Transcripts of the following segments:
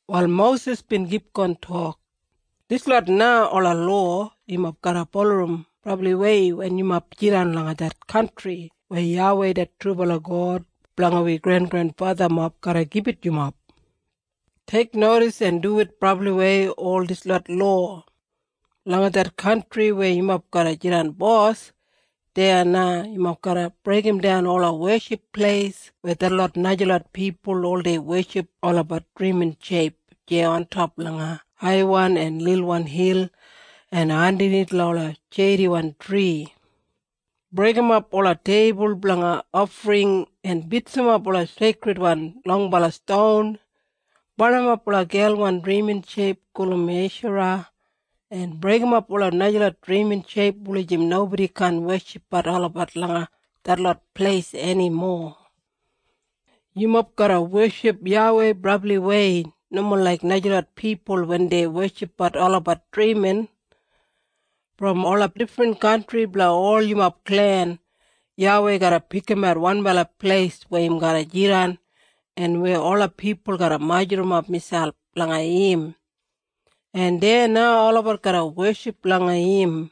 Wal Mosis bin kipgon tok, “Dislot na ola lowa yumob garra bulurrum brabliwei wen yumob jidan langa det kantri weya YAWEI det trubala God blanga wi grengrenfathamob garra gibit yumob. Teiknodis en duwit brabliwei ol dislot lowa! Langa det kantri weya yumob garra jidan bos, deya na yumob garra breigimdan ola weship pleis weya detlot najalot pipul oldei weship olabat drimin sheip deya ontop langa haiwan en lilwan hil en andanith langa ola sheidiwan tri. Breigimap ola teibul blanga ofring en bitsimap ola seikridwan longbala ston. Barnimap ola gelwan drimin sheip gulum Eshara, en breigimap ola najalot drimin sheip wulijim nobodi kaan weshipbat olabat langa detlot pleis enimo. “Yumob garra weship YAWEI brabliwei, nomo laik najalot pipul wen dei weshipbat olabat drimin. Brom ola difrin kantri blanga ol yumob klen, YAWEI garra pikimat wanbala pleis weya im garra jidan en weya ola pipul garra majurrumap miselp langa im, en deya na olabat garra weship langa im.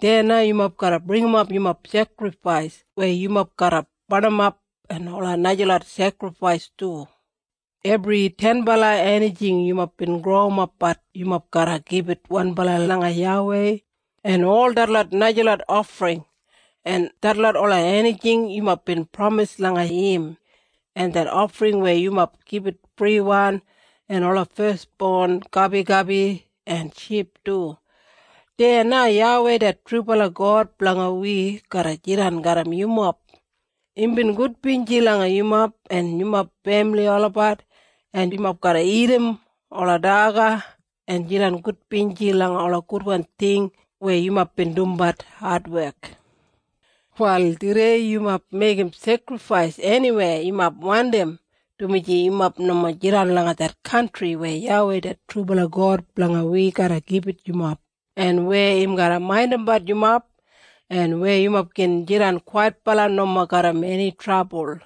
Deya na yumob garra bringimap yumob sekrifais weya yumob garra barnimap en ola najalot sekrifais du. Ebri tenbala enijing yumob bin growimbat yumob garra gibit wanbala langa mi, en ol detlot najalot ofring, en detlot ola enijing yumob bin pramis langa YAWEI, en det ofring weya yumob gibit friwan, en ola fesbon gabigabi en ship du. Deya na YAWEI det trubala God blanga wi garra jidan garram yumob. Imbin gudbinji langa yumob en yumob femili olabat, en yumob garra dagat ola daga en jidan gudbinji langa ola gudwan ting weya yumob bin dumbat adwek. “Wal tudei yumob meigim sekrifais eniweya yumob wandim, dumaji yumob nomo jidan langa det kantri weya YAWEI det trubala God blanga wi garra gibit yumob en weya im garra maindimbat yumob en weya yumob gin jidan kwaitbala nomo garram eni trabul.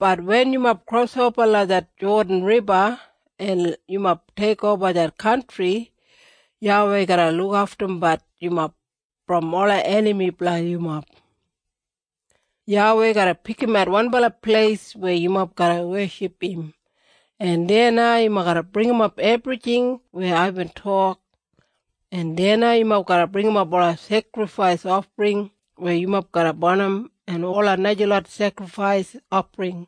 Bat wen yumob krosoba langa det Jodan Riba en yumob teikoba det kantri, YAWEI garra lukaftumbat yumob brom ola enami blanga yumob. YAWEI garra pikimat wanbala pleis weya yumob garra weship im, en deya na yumob garra bringimap ebrijing weya aibin tok. En deya na yumob garra bringimap ola sekrifais ofring weya yumob garra barnim, en ola najalot sekrifais ofring,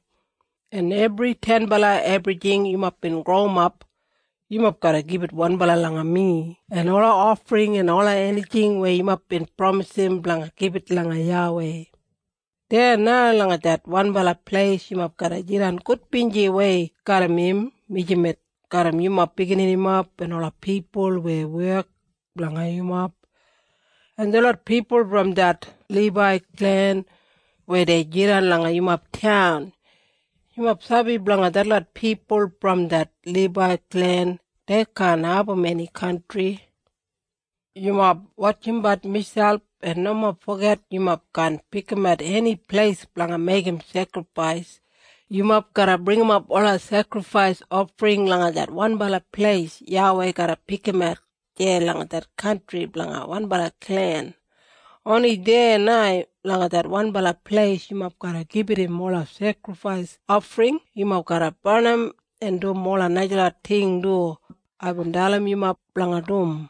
en ebri tenbala ebrijing yumob bin growimap yumob garra gibit wanbala langa mi en ola ofring en ola enijing weya yumob bin pramisim blanga gibit langa YAWEI. Deya na langa det wanbala pleis yumob garra jidan gudbinjiwei garram im mijamet garram yumob bigininimob en ola pipul weya wek blanga yumob, en detlot pipul brom det Libai klen weya dei jidan langa yumob taun. Yumob sabi blanga detlot pipul brom det Libai klen dei kaan abum eni kantri. Yumob wotjimbat miselp en nomo foget yumob kaan pikimat eni pleis blanga meigim sekrifais. Yumob garra bringimap ola sekrifais ofring langa det wanbala pleis YAWEI garra pikimat deya langa det kantri blanga wanbala klen. Oni deya na langa det wanbala pleis yumob garra gibit im ola sekrifais ofring yumob garra barnim, en dum ola najalot ting du aibin dalim yumob blanga dum.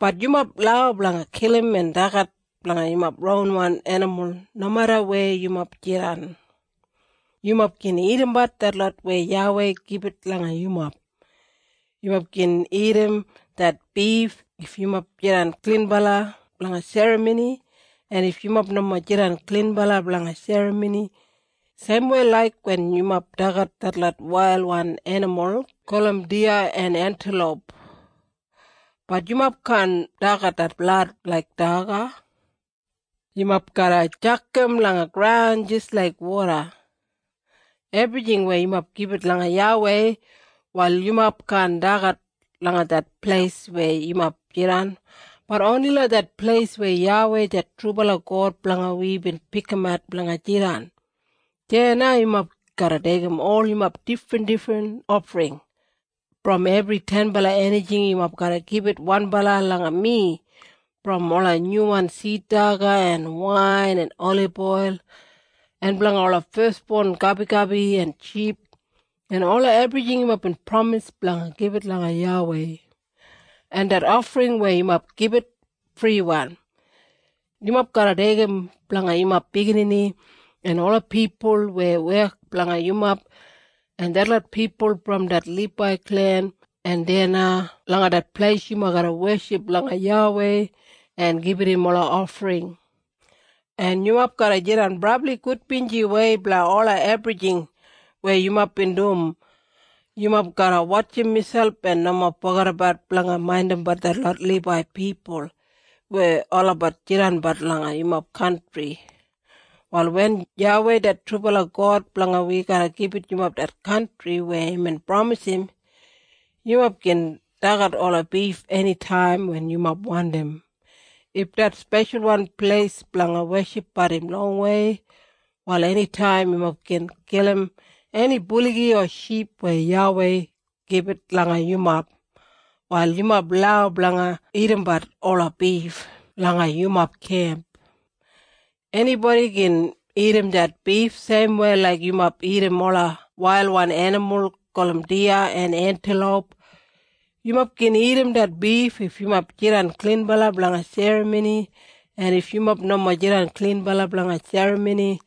“Bat yumob lau blanga kilim en dagat blanga yumob ronwan enimul nomeda weya yumob jidan. Yumob gin dagadagatbat detlot weya YAWEI gibit langa yumob. Yumob gin dagat det bif if yumob jidan klinbala blanga serramoni en if yumob nomo jidan klinbala blanga serramoni, seimwei laik wen yumob dagat detlot wailwan enimul gulum diya en entiloup. Bat yumob kaan dagat det blad laik daga. Yumob garra tjakam langa graun jis laik woda. “Ebrijing weya yumob gibit langa YAWEI, wal yumob kaan dagat langa det pleis weya yumob jidan, bat oni langa det pleis weya YAWEI det trubala God blanga wi bin pikimat blanga jidan. Deya na yumob garra deigim ol yumob difrindifrinwan ofring. Brom ebri tenbala enijing yumob garra gibit wanbala langa mi brom ola nyuwan sid daga en wain en oliboil, en blanga ola fesbon gabigabi en ship en ola ebrijing yumob bin pramis blanga gibit langa YAWEI, en det ofring weya yumob gibit friwan. Yumob garra deigim blanga yumob biginini en ola pipul weya wek blanga yumob en detlot pipul brom det Libai klen en deya na langa det pleis yumob garra weship langa YAWEI en gibit im ola ofring. En yumob garra jidan brabli gudbinjiwei blanga ola ebrijing weya yumob bin dum. Yumob garra wotjim miselp en nomo fogedabat blanga maindimbat detlot Libai pipul weya olabat jidanbat langa yumob kantri. “Wal wen YAWEI det trubala God blanga wi garra gibit yumob det kantri weya imbin pramisim, yumob gin dagat ola bif enitaim wen yumob wandim. If det speshalwan pleis blanga weshipbat im longwei, wal enitaim yumob gin kilim eni buligi o ship weya YAWEI gibit langa yumob, wal yumob lau blanga dagatbat ola bif langa yumob kemp. Enibodi gin dagat det bif seimwei laik yumob dagat ola wailwan enimul gulum diya en entiloup. Yumob gin dagat det bif if yumob jidan klinbala blanga serramoni, en if yumob nomo jidan klinbala blanga serramoni.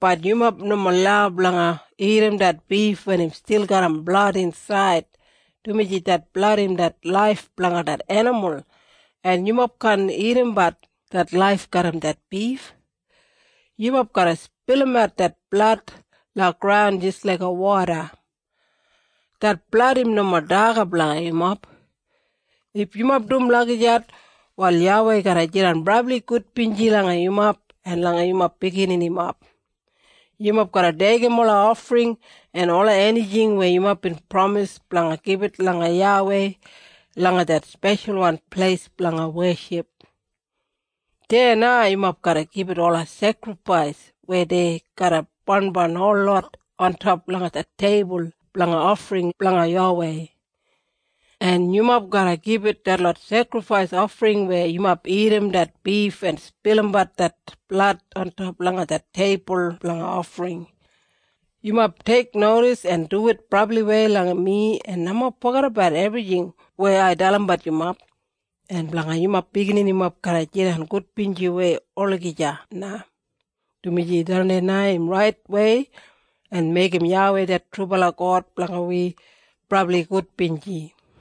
Bat yumob nomo lau blanga dagat det bif wen im stil garram blad insaid, dumaji det blad im det laif blanga det enimul. En yumob kaan dagadagat det laif garram det bif. Yumob garra spilimat det blad langa graun jis laiga woda. Det blad im nomo daga blanga yumob. If yumob dum lagijat, wal YAWEI garra jidan brabli gudbinji langa yumob en langa yumob bigininimob. Yumob garra deigim ola ofring en ola enijing weya yumob bin pramis blanga gibit langa YAWEI langa det speshalwan pleis blanga weship. Deya na yumob garra gibit ola sekrifais weya dei garra barnbarn holot ontop langa det teibul blanga ofring blanga YAWEI. En yumob garra gibit detlot sekrifais ofring weya yumob dagat det bif en spilimat det blad ontop langa det teibul blanga ofring. Yumob teiknodis en duwit brabliwei langa mi en nomo fogedabat ebrijing weya ai dalimbat yumob, en blanga yumob bigininimob garra jidan gudbinjiwei olagija na, dumaji tharran na im raitwei en meigim YAWEI det trubala God blanga wi brabli gudbinji.”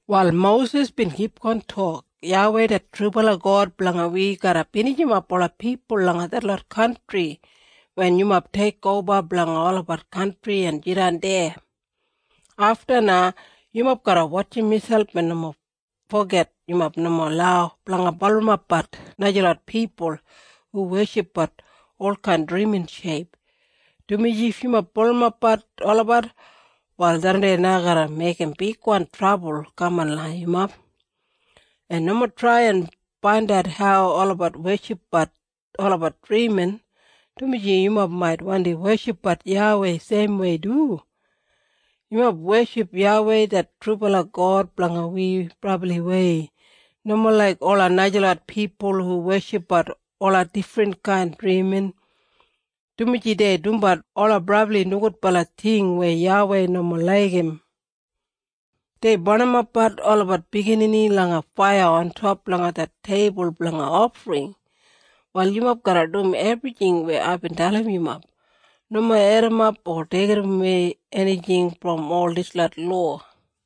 Wal Mosis bin kipgon tok, “YAWEI det trubala God blanga wi garra binijimap ola pipul langa detlot kantri wen yumob teikoba blanga olabat kantri en jidan deya. Afta na, yumob garra wotjim miselp en nomo foget yumob nomo lau blanga bulurrumbat najalot pipul hu weshipbat olkain drimin sheip, dumaji if yumob bulurrumbat olabat, wal tharran garra meigim bigwan trabul kaman langa yumob. En nomo trai en faindat hau olabat weshipbat olabat drimin, dumaji yumob mait wandi weshipbat YAWEI seimwei du. Yumob weship YAWEI det trubala God blanga wi brabliwei, nomo laik ola najalot pipul hu weshipbat ola difrinkain drimin, dumaji dei dumbat ola brabli nogudbala ting weya YAWEI nomo laigim. Dei barnimapbat olabat biginini langa faiya ontop langa det teibul blanga ofring. “Wal yumob garra dum ebrijing weya aibin dalimbat yumob. Nomo edimap o deigimwei enijing brom ol dislot lowa.”